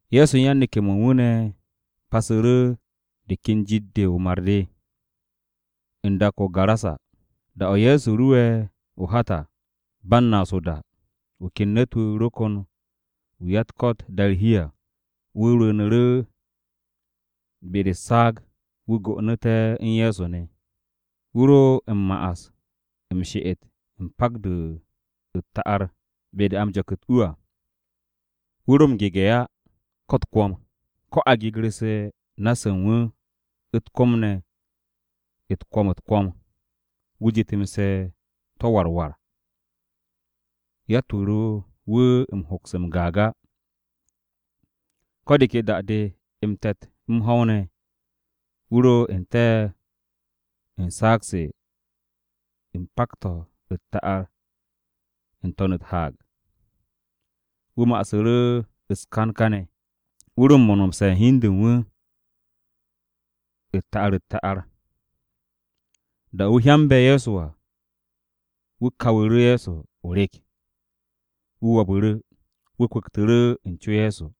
Ye̱so u̱n yan-neke̱-mo̱ u̱n wu̱ ne̱ pasu̱ru̱ de ka jit-de o-mar de, u̱n dak-o̱ o-Garasa. Da-o̱ Ye̱so ru'e̱ o-hat à, ba u̱n naas o-da, wu̱ ken ne̱t-wu̱ ro kon wu̱ ko-ya-u̱t-ko̱t da'e̱ u̱r-hi à. Wu̱ rwu̱u̱nu̱ru̱ be-de u̱s-saag, wu̱ go'onu̱te̱ u̱n Ye̱so ne̱. Wu̱ ro m-ma'as m-she'et u̱n pak-to̱ u̱t-ta'ar be-de a m-jo̱k u̱t-u à. Wu̱ ro m-gege̱ á ko̱ u̱t-kwo̱m. Ko̱ a gegu̱rse̱ na-se u̱n wu̱ u̱t-kom ne̱ u̱t-kwo̱m u̱t-kwo̱m, wu̱ jetemse̱ to̱ war war. Yatt-wu̱ ro wu̱ m-hoks m-gaag á. Ko̱ de ke da-de, m-te̱t m-ho̱w ne̱, wu̱ ro n-te̱ u̱n saag-se u̱n pak-to̱ u̱t-ta'ar, n-to̱n u̱t-haag. Wu̱ ma'asu̱ru̱ u̱s-kan kane̱. Wu̱ ro m-monomse̱ u̱n hi u̱n de u̱n wu̱ u̱t-ta'ar u̱t-ta'ar. Da-o̱ wu̱ hyambe̱ Ye̱so à, wu̱ kawu̱ru̱ Ye̱so o-rek. Wu̱ wo̱bu̱ru̱. Wu̱ kwu̱ktu̱ru̱ u̱n co Ye̱so.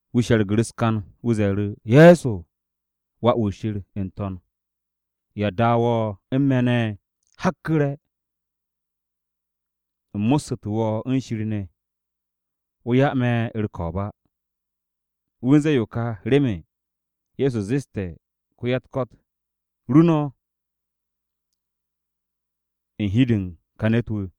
Wu̱ she̱rgu̱ru̱ u̱s-kan. Wu̱ ze̱e̱ru̱, “Ye̱so, Wà-wu̱ Shir, n-to̱n, ¿ya da wo̱ u̱n me̱ ne̱? Hakku̱re̱, u̱m mo̱ssu̱te̱ wo̱ u̱n Shir ne̱, wo̱ 'ya me̱ u̱r-ko̱o̱b á!” Wu̱ u̱n ze̱e̱ yo ka remen Ye̱so zeste̱ ko-ya-u̱t-ko̱t, “Ru no̱ u̱n hi-de u̱n ka ne̱t-wu̱.”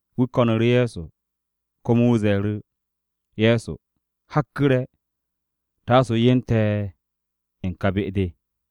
Wu̱ ko̱nu̱ru̱ Ye̱so komo wu̱ ze̱e̱ru̱, “Ye̱so hakku̱re̱, taasu̱ o yen te̱ u̱n ka be-de.”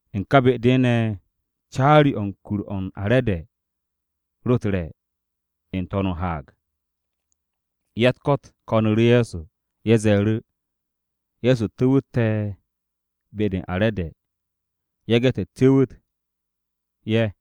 U̱n ka be-de ne̱, caari-o̱ u̱n kur-o̱ u̱n are̱de ro u̱t-re̱ n-to̱n u̱r-haag. Ya-u̱t-ko̱t ko̱nu̱ru̱ Ye̱so. Ye̱ ze̱e̱ru̱, “Ye̱so tu̱wu̱t te̱ be-de u̱n are̱de yage̱ te̱ cu̱wu̱t ye̱.”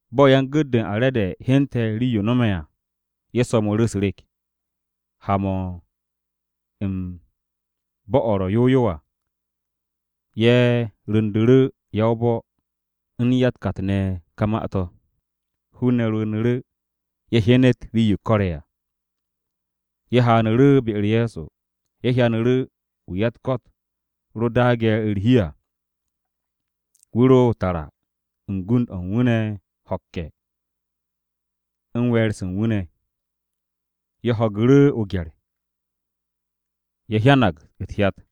Bo̱ yan-gu̱t-de u̱n are̱de hyente̱ rii-yo no̱me̱ à, ye̱ so̱mu̱ru̱ u̱s-rek, ha-mo̱ u̱n bo̱-o̱ ro̱ yow yow à. Ye̱ ru̱ndu̱ru̱ ya-o-bo̱ u̱n riib-se u̱n o̱ ne̱ ka ma-to̱. Hun-ne̱ rwu̱u̱nu̱ru̱, ye̱ hyenet rii-yo ko̱re̱ à. Ye̱ haanu̱ru̱ be-u̱r Ye̱so, ye̱ hyanu̱ru̱ wu̱ ya-u̱t-ko̱t ro daage̱ u̱r-hi à. Wu̱ ro tara u̱n gund-o̱ u̱n wu̱ ne̱ ho̱kke̱ u̱n we̱e̱r-se u̱n wu̱ ne̱. Ye̱ ho̱gu̱ru̱ o-gye̱r. Ye̱ hyanag u̱t-hyat.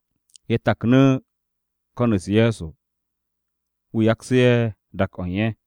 Ye̱ taknu̱ ko̱n-u̱s Ye̱so wu̱ yaksu̱ ye̱ dak-o̱ u̱n ye̱.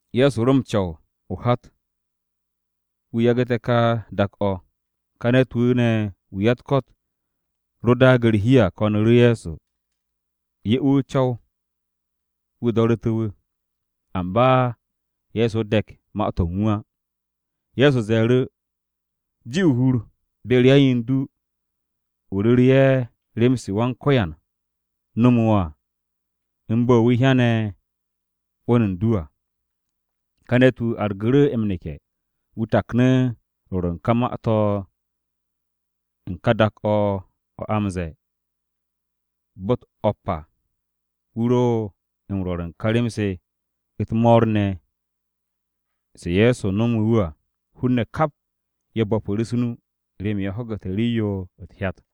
Ye̱so ro m-co̱w o-hat wu̱ yagu̱te̱ ka dak-o̱ o̱ ka. Ka ne̱t-wu̱ ne̱ wu̱ ya-u̱t-ko̱t ro daage̱ u̱r-hi à ko̱nu̱ru̱ Ye̱so 'ye wu̱ o-co̱w wu̱ do̱ru̱té̱ wu̱. Amba Ye̱so de̱k ma-to̱ u̱n wu̱ á. Ye̱so ze̱e̱ru̱, “Ji o-hur be-u̱r yan-yen-du du. O ru̱re̱ ye̱ rem-se Wan-Ko̱yan nomu̱ wo̱ à, u̱n bo̱ wu̱ hyane̱ 'wo̱n u̱n du à.” Ká ne̱t-wu̱ argu̱ru̱ m-neke̱. Wu̱ taknu̱ rwo̱r u̱n ka ma-to̱ u̱n ka dak-o̱ o̱ a m-ze̱e̱ Bo̱-u̱t O̱p à. Wu̱ ro m-rwo̱r u̱n ka rem-se u̱t-mo̱o̱r ne̱ se Ye̱so nomu̱ wu̱ à. Hun-ne̱ kap ye̱ bo̱pu̱ru̱ u̱s-nu remen ye̱ ho̱gu̱te̱ rii-yo u̱t-hyat.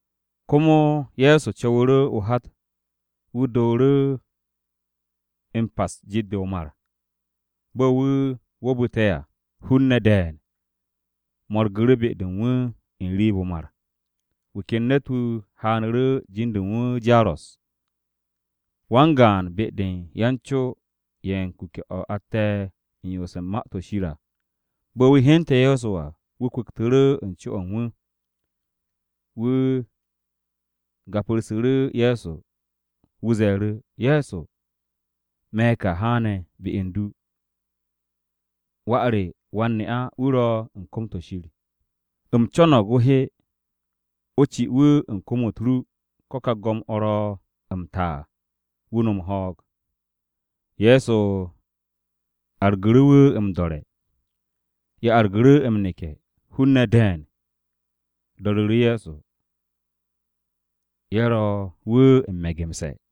Komo Ye̱so co̱wu̱ru̱ o-hat wu̱ dooru̱ m-pas u̱n jit-de o-mar. Bo̱ wu̱ wo̱o̱bu̱te̱ à, hun-ne̱ de̱e̱n mo̱rgu̱ru̱ be-de u̱n wu̱ n-riib o-mar. Wu̱ ken ne̱t-wu̱ haanu̱ru̱, jin-de u̱n wu̱ Jaros. Wan-gaan be-de u̱n yan-co ye̱ u̱n kuke̱-o̱ atte̱ u̱n yoos u̱n Ma-to̱ Shir à. Bo̱ wu̱ hyente̱ Ye̱so à, wu̱ kwu̱ktu̱ru̱ u̱n co-o̱ u̱n wu̱. Wu̱ gapu̱rsu̱ru̱ Ye̱so, wu̱ ze̱e̱ru̱, “Ye̱so, me̱ ka haane̱ be u̱n du. Wà re wan-ne'a-wu̱ ro̱ u̱n kom-to̱ Shir. U̱m co̱no̱g o he, o ci wu̱ u̱n kom-u̱t ru ko̱ ka go̱m-o̱ ro̱ m-ta à, wu̱ nom ho̱o̱g.” Ye̱so argu̱ru̱ wu̱ m-do̱re̱. Ye̱ argu̱ru̱ m-neke̱. Hun-ne̱ de̱e̱n do̱ru̱ru̱ Ye̱so. Ye̱ ro wu̱ m-me̱gemse̱.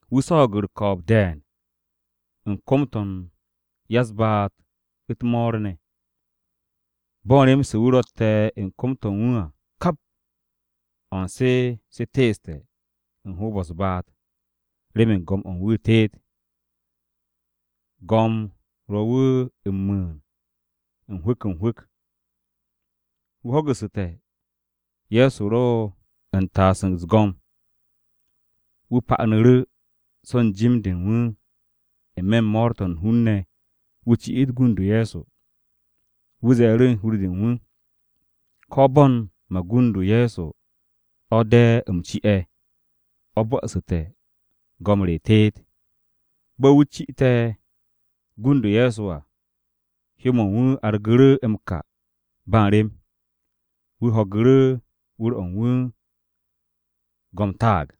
Wu̱ swo̱o̱g u̱r-ko̱o̱b de̱e̱n u̱n kom-to̱ u̱n ya-u̱s-ba'at u̱t-mo̱o̱r ne̱. Bo̱ u̱n rem-se wu̱ rotte̱ u̱n kom-to̱ u̱n wu̱ à, kap o̱ u̱n se se teeste̱ u̱n hoob-o̱ u̱s-baat remen go̱m-o̱ u̱n wu̱ teet. Go̱m ro wu̱ m-mu̱u̱n n-hwu̱k n-hwu̱k. Wu̱ ho̱gu̱su̱te̱ Ye̱so ro u̱n taas u̱s-go̱m. Wu̱ pa'anu̱ru̱ so̱ u̱n jim-de u̱n wu̱ n-me̱ u̱n mo̱o̱r-to̱ u̱n hun-ne̱ wu̱ ci'it gund-o Ye̱so. Wu̱ ze̱e̱ru̱ u̱n hur-de u̱n wu̱, “Ko̱ bo̱ u̱n gund-o Ye̱so o̱ de̱ u̱m ci'e̱, o̱ bo̱'o̱su̱te̱ go̱m re teet.” Bo̱ wu̱ ci'ite̱ gund-o Ye̱so à, hyó-mo̱ u̱n wu̱ argu̱ru̱ m-ka ba u̱n rem. Wu̱ ho̱gu̱ru̱ u̱n wu̱r-o̱ u̱n wu̱ go̱m taag.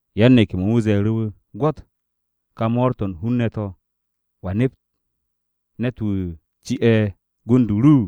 Yan-neke̱-mo̱ u̱n wu̱ ze̱e̱ru̱ wu̱, “Gwo̱t ka mo̱o̱r-to̱ u̱n hun-ne̱ to̱. ¿Wa nep ne̱t-wu̱ ci'e̱ gund-o ru?”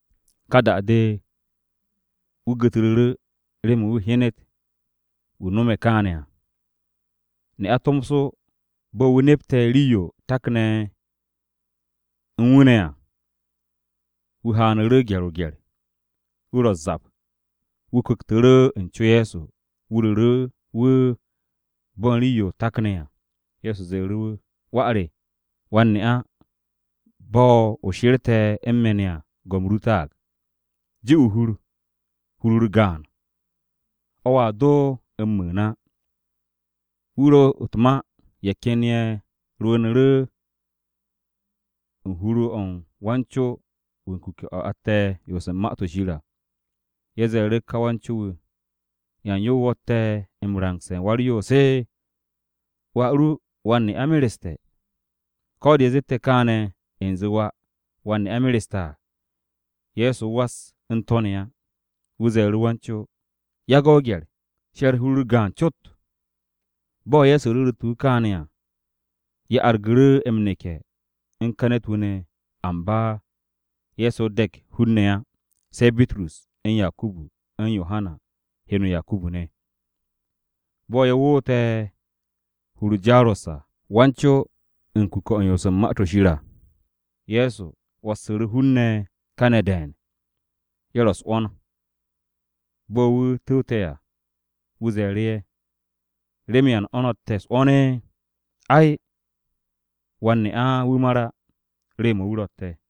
Ka da-de, wu̱ gu̱tru̱ru̱ remen wu̱ hyenet wu̱ no̱me̱ kaane̱ à. Ne'a tomso, bo̱ wu̱ nepte̱ rii-yo takne̱ u̱n wu̱ ne̱ à, wu̱ haanu̱ru̱ gye̱r-o-gye̱r. Wu̱ ro u̱s-zap. Wu̱ kwu̱ktu̱ru̱ u̱n co Ye̱so, wu̱ ru̱ru̱ wu̱ bo̱ u̱n rii-yo takne̱ à. Ye̱so ze̱e̱ru̱ wu̱, “Wà re, wan-ne'a bo̱ o she̱rte̱ u̱n me̱ ne̱ à, go̱m ru taag. Ji o-hur, hur-u̱r gaan. O̱a do m-mu̱u̱n á.” Wu̱ ro u̱t-ma, ye̱ ken ye̱ rwu̱u̱nu̱ru̱ u̱n hur-o̱ u̱n wan-co-wu̱ u̱n kuke̱-o̱ atte̱ u̱n yoos u̱n Ma-to̱ Shir à. Ye̱ ze̱e̱ru̱ ka wan-co-wu̱, “¿Yan yo wo̱tte̱ u̱n rangse̱ u̱n Wa-u̱r-Yoos? Wà ru wan-ne'a mereste̱.” Ko̱ de̱ ye̱ zette̱ kaane̱, u̱nze wà wan-ne'a mereste̱ à, Ye̱so was u̱n to̱ ne̱ á. Wu̱ ze̱e̱ru̱ wan-co, “Yage̱ o-gye̱r. She̱r hur-u̱r gaan cot.” Bo̱ Ye̱so ru̱ru̱tu̱ wu̱ kaane̱ à, ye̱ argu̱ru̱ m-neke̱ u̱n ka ne̱t-wu̱ ne̱, amba Ye̱so de̱k hun-ne̱ á, se̱ Bitrus, u̱n Yakubu, u̱n Yohana (heno Yakubu) ne̱. Bo̱ ye̱ woote̱ u̱n hur-o Jaros à (wan-co u̱n kuke̱-o̱ u̱n yoos u̱n Ma-to̱ Shir à), Ye̱so 'wo̱ssu̱ru̱ hun-ne̱ kane̱ de̱e̱n. Ye̱ ro u̱s-'wo̱n. Bo̱ wu̱ tu̱wte̱ à, wu̱ ze̱e̱ru̱ ye̱, “¿Remen yan o̱ no̱tte̱ u̱s-'wo̱n? Ay, wan-ne'a-wu̱ mar á. Rew-mo̱ wu̱ ro̱tte̱.”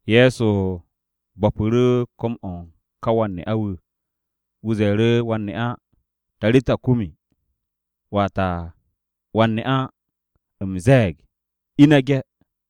Ye̱so bo̱pu̱ru̱ kom-o̱ u̱n ka wan-ne'a-wu̱. Wu̱ ze̱e̱ru̱ wan-ne'a, “Tarita kumi!” (Wata, “Wan-ne'a, u̱m ze̱e̱g, ine̱ ge̱!”)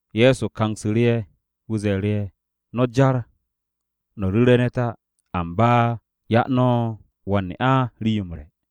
Ye̱so kangsu̱ru̱ ye̱. Wu̱ ze̱e̱ru̱, “No̱ jar no̱ ru̱re̱ ne̱t á, amba 'ya no̱ wan-ne'a rii-yo m-re̱.”